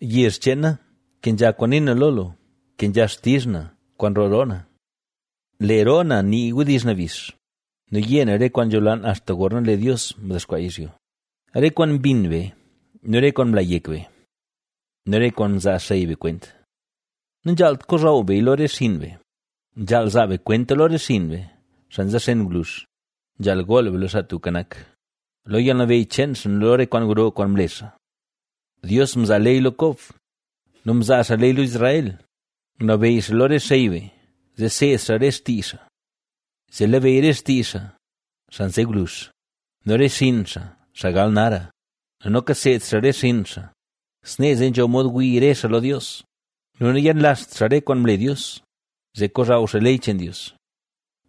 Yezh cheen na, kenzha kwaan nii na lo gu; kenzha xtizh na kwaan nroo roo na. Lee roo na nii wdizh nabix nu yé na re kwaan nzholaan axta gorna lee Dios mdexkwaa yizhyo; re kwaan mbin be nu re kwaan mla yek be nu re kwaan mzaa xey be kwent. Nanzhaalt kozhaw beya lo re xinn be, nzhaal zaa be kwenta lo re xinn be, xaa nzexen gwluzh; nzhaal gool be lo Xaa Tubka Nak, lo yalnabeyy cheen xaa nu lo re kwaan gro kwaan mle xaa. Dios mzaa ley lo Kob; mzaa xaa ley lo Israel, ngunabeyy xaa lo re xey be, zee seed xaa re xtii xaa. Zee labeyy re xtii xaa, xaa nze gwluzh nu re xinn xaa, xaa gal nara nu noka seed xaa re xinn xaa, snee zee nzho mod wii re xaa lo Dios nu nayenlazht xaa re kwaan mle Dios, zee kozhaw xaa ley cheen Dios.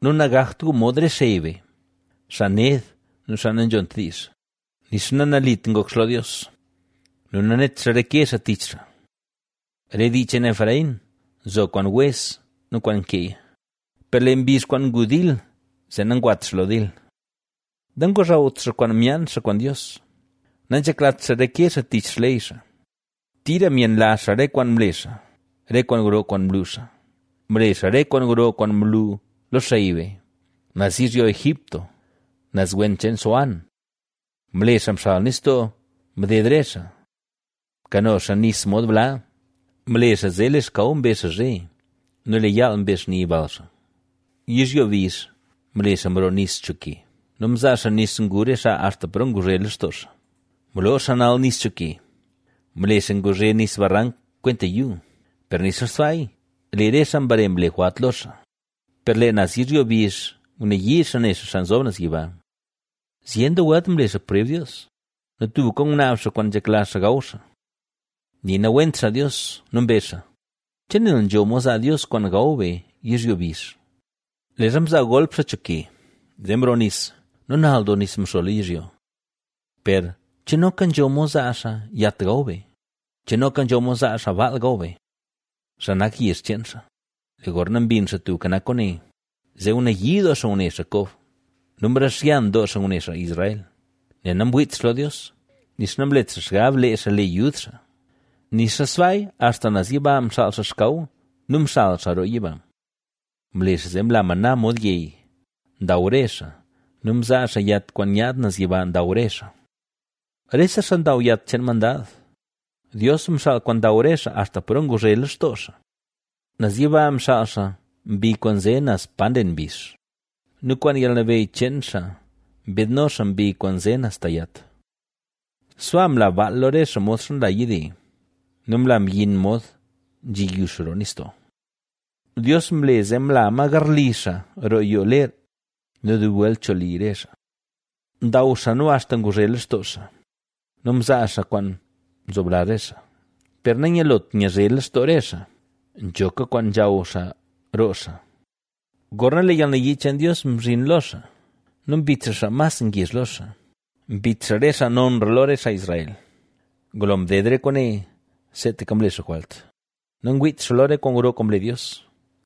Nu nagakt gu mod re xey be, xaa ned nu xaa nanzhont diizh, nixa nanalit ngok xaa lo Dios nu nanet xaa reke xaa tich xaa. Re dii cheen Efraín nzo kwaan wez nu kwaan nkeeya, per lee mbizh kwaan ngu dil zee nangwat xaa lo dil. Nangozhawt xaa kwaan myaan xaa kwaan Dios, nanzheklat xaa reke xaa tich xley xaa. Tira myenlazh xaa re kwaan mle xaa re kwaan gro kwaan mlu xaa. Mle xaa re kwaan gro kwaan mlu lo xey be, naz yizhyo Egipto, naz wen cheen Zoán. Mle xaa mxal nistoo mded re xaa. Mkano xaa nis mod bla. Mle xaa zee lee xkaw mbe xaa zhe, nu lee yaal mbe xni bal xaa. Yizhyo bizh mle xaa mroo nis cho ke, nu mzaa xaa nis ngu re xaa axta paro nguzhe lextoo xaa. Mloo xaa nal nis cho ke, mle xaa nguzhe nis barank kwenta yuu. Per nixa sbaaya, lee re xaa mbare mle jwalt lo xaa, per lee naz yizhyo bizh ngunayii xaa ne xaa Xaa Nzob Naz Yiba. Zyen doo welt mle xaa preb Dios, nu tubka ngunaab xaa kwaan nzhekla xaa gaw xaa. Nii nawent xaa Dios nu mbezh xaa: “¿Che nel nzho mod zaa Dios kwaan gaw be yizhyo bizh? Leezha mzaa golp xaa cho ke, zee mroo nis nu nal doo nis mxo lo yizhyo. Per, ¿che noka nzho mod zaa xaa yat gaw be? ¿Che noka nzho mod zaa xaa baal gaw be, xaa nak yezh cheen xaa?” Lee gorna mbin Xaa Tubka Nak kwaane; zee ngunayii doo xaa ngune xaa Kob nu mrixyan doo xaa ngune xaa Israel, Nel namwiit xaa lo Dios, nixa namlet xaa xgab lee xaa le yud xaa. Nixa sbaaya axta naz yiba mxaal xaa xkaw, nu mxal xaa roo yiba. Mle xaa zee mla maná mod yey, ndaw re xaa nu mzaa xaa yat kwaan nyaad naz yiba ndaw re xaa. Rese xaa ndaw yat cheen mandad; Dios mxaal kwaan ndaw re xaa axta paro nguzhe lextoo xaa. Naz yiba mxaal xaa mbi kwaan nze naz pa nlen mbizh nu kwaan yalnabeyy cheen xaa mbiidno xaa mbi kwaan nze naz ta yat. Sbaa mla baal lo re xaa modxa nla yide, nu mla myin mod nzhi yux roo nistoo. Dios mle zee mla ma garli xaa roo yoo ler nu dub welt cho li re xaa. Ndaw xaa nu axta nguzhe lextoo xaa nu mzaa xaa kwaan nzoblazh re xaa. Per nanyalot nyazhe lextoo xaa, nzhoka kwaan nzhaw xaa roo xaa, gorna lee yalnayii cheen Dios mzhin lo xaa nu mbit xaa xaa mas ngezh lo xaa, mbit xaa re xaa nonra lo re xaa Israel. Ngulo mded re kwaane seetaka mle xaa jwalt; nangwiit xaa lo re kwaan gro kwaan mle Dios.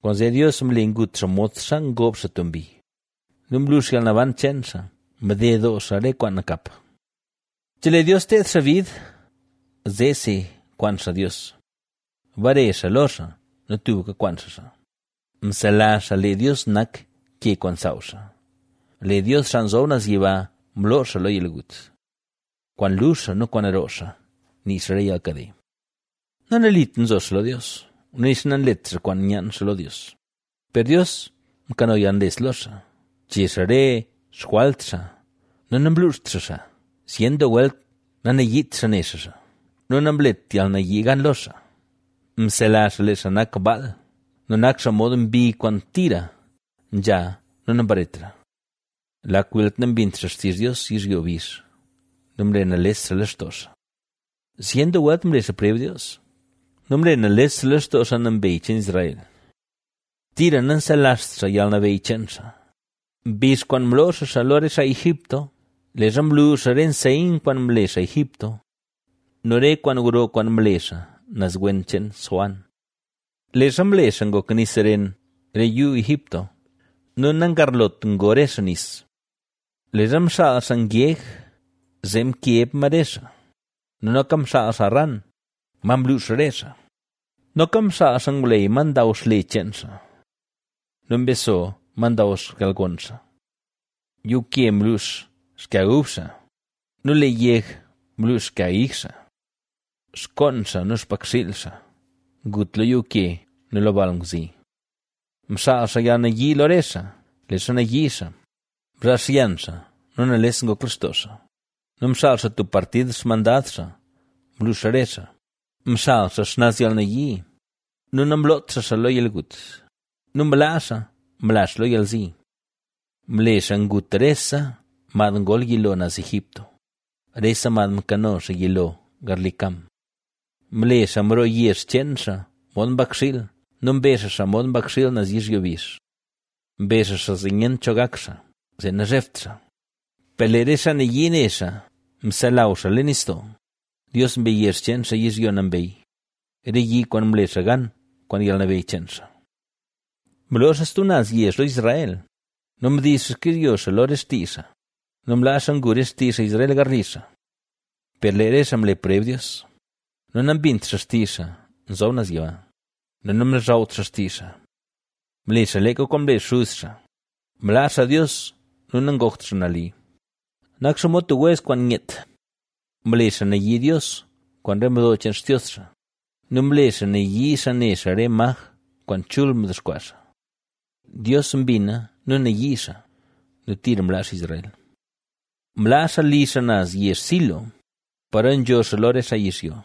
Kwaanzee Dios mle ngut xaa modxa ngob xaa tub mbi nu mlux yalnaban cheen xaa, mded doo xaa re kwaan nakap. Chelee Dios teed xaa bid zeesi kwaan xaa Dios; bare xaa lo xaa nu tubka kwaan xaa xaa. Mselazh xaa lee Dios nak ke kwaan nsaaw xaa, lee Dios, Xaa Nzob Naz Yiba, mloo xaa lo yalgut. Kwaan luzh xaa nu kwaan roo xaa, nii xaa re yalkade. Nanalit nzo xaa lo Dios nu nixa nanlet xaa kwaan nyaan xaa lo Dios. Per Dios mkano yalnles lo xaa, mche xaa re xjwalt xaa nu namluuxt xaa xaa. Zyen doo welt nanayiit xaa ne xaa xaa nu namlet yalnayii gan lo xaa. Mselazh xaa lee xaa nak baal, nu nak xaa mod mbi kwaan tira nzha nu nambaretra. ¡Lak welt nambint xaa xtizh Dios yizhyo bizh nu mle nales xaa lextoo xaa! Zyen doo welt mle xaa preb Dios; nu mle nales xaa lextoo xaa Nambey cheen Israel. Tira nanselazht xaa yalnabeyy cheen xaa, mbizh kwaan mloo xaa xaa lo re xaa Egipto; leezha mlu xaa re nseyn kwaan mle xaa Egipto nu re kwaan gro kwaan mle xaa naz wen cheen Zoán. Leezha mle xaa ngok nis ren re yuu Egipto nu nangarlot ngo re xaa nis. Leezha mxaal xaa ngeg zee mkeb ma re xaa nu noka mxaal xaa ran, ma mluux re xaa; noka mxaal xaa ngwleyy, ma ndaw xle cheen xaa nu mbeso, ma ndaw xkalgon xaa. Yuuke mluux xkag ub xaa nu lee yeg mluux xkag ig xaa. Xkoon xaa nu xpakxiil xaa ngut lo yuuke nu lo balngwzi. Mxaal xaa yalnayii lo re xaa, leezha nayii xaa, mzhaal xyan xaa nu nales ngok lextoo xaa ¡nu mxaal xaa tub partid xmandad xaa mluux re xaa! Mxal xaa xnaz yalnayii nu namloot xaa xaa lo yalgut nu mlaa xaa mla xaa lo yalzi. Mle xaa ngut rese mad ngol yilo naz Egipto, rese mad mkano xaa yilo garli Cam. Mle xaa mroo yezh cheen xaa mod mbakxiil nu mbe xaa xaa mod mbakxiil naz yizhyo bizh. Mbe xaa xaa zee nyent cho gak xaa, zee nazhebt xaa, per lee re xaa nayii ne xaa mselaw xaa leen nistoo. Dios mbe yezh cheen xaa yizhyo nambey, re yi kwaan mle xaa gan kwaan yalnabeyy cheen xaa. Mloo xaa stub naz yezh lo Israel nu mdiiz xaa xkizhyo xaa lo re xtii xaa nu mlaa xaa ngu re xtii Israel garli xaa. Per lee re xaa mle preb Dios nu nambint xaa xtizh Xaa Nzob Naz Yiba nu namlozhawt xaa xtizh xaa. Mle xaa leeka kwaan mle xuz xaa, mlaa xaa Dios nu nangokt xaa nali; nak xaa mod tub wez kwaan nyeet. Mle xaa nayii Dios kwaan re mdo cheen xtios xaa nu mle xaa nayii xaa ne xaa re maj kwaan chul mdexkwaa xaa. Dios mbina nu nayii xaa nu tira mlaa xaa Israel. Mlaa xaa li xaa naz yezh Silo, paro nzho xaa lo re xaa yizhyo.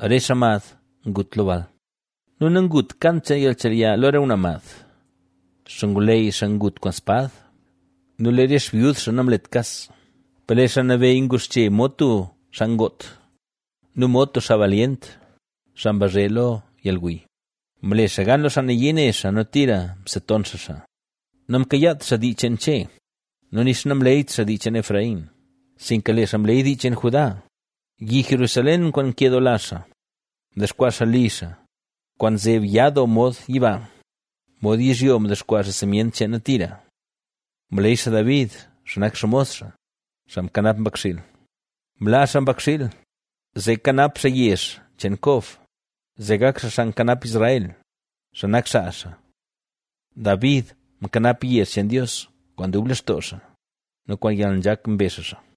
Re xaa mad ngut lo bal; nangut kant cheen yalnchelya lo re ngwnaa mad. Xngwleyy xaa ngut kwaan spad nu lee re xbyud xaa namlet kas. Per lee Xaa Nabeyy nguxche mod tub xaa ngoot nu mod tub xaa balyent, xaa mbazhe lo yalguy, Mle xaa gan lo xaa nayii ne xaa nu tira mseton xaa xaa. Namkayaat xaa dii cheen Che nu nixa namleeyt xaa dii cheen Efraín; sinka lee xaa mleey dii cheen Judá, yi Jerusalén kwaan nkedoola xaa. Mdexkwaa xaa li xaa, kwaan nzeb ya doo mod yiba, mod yizhyo mdexkwaa xaa simyent cheena tira. Mleey xaa David, xaa nak xmos xaa, xaa mkanap mbakxiil; mlaa xaa mbakxiil, zee kanap xaa yezh cheen Kob, zee gak xaa xaa nkanap Israel, xaa nak xaa xaa. David mkanap yezh cheen Dios kwaan dub lextoo xaa nu kwaan yalnzhak mbe xaa xaa.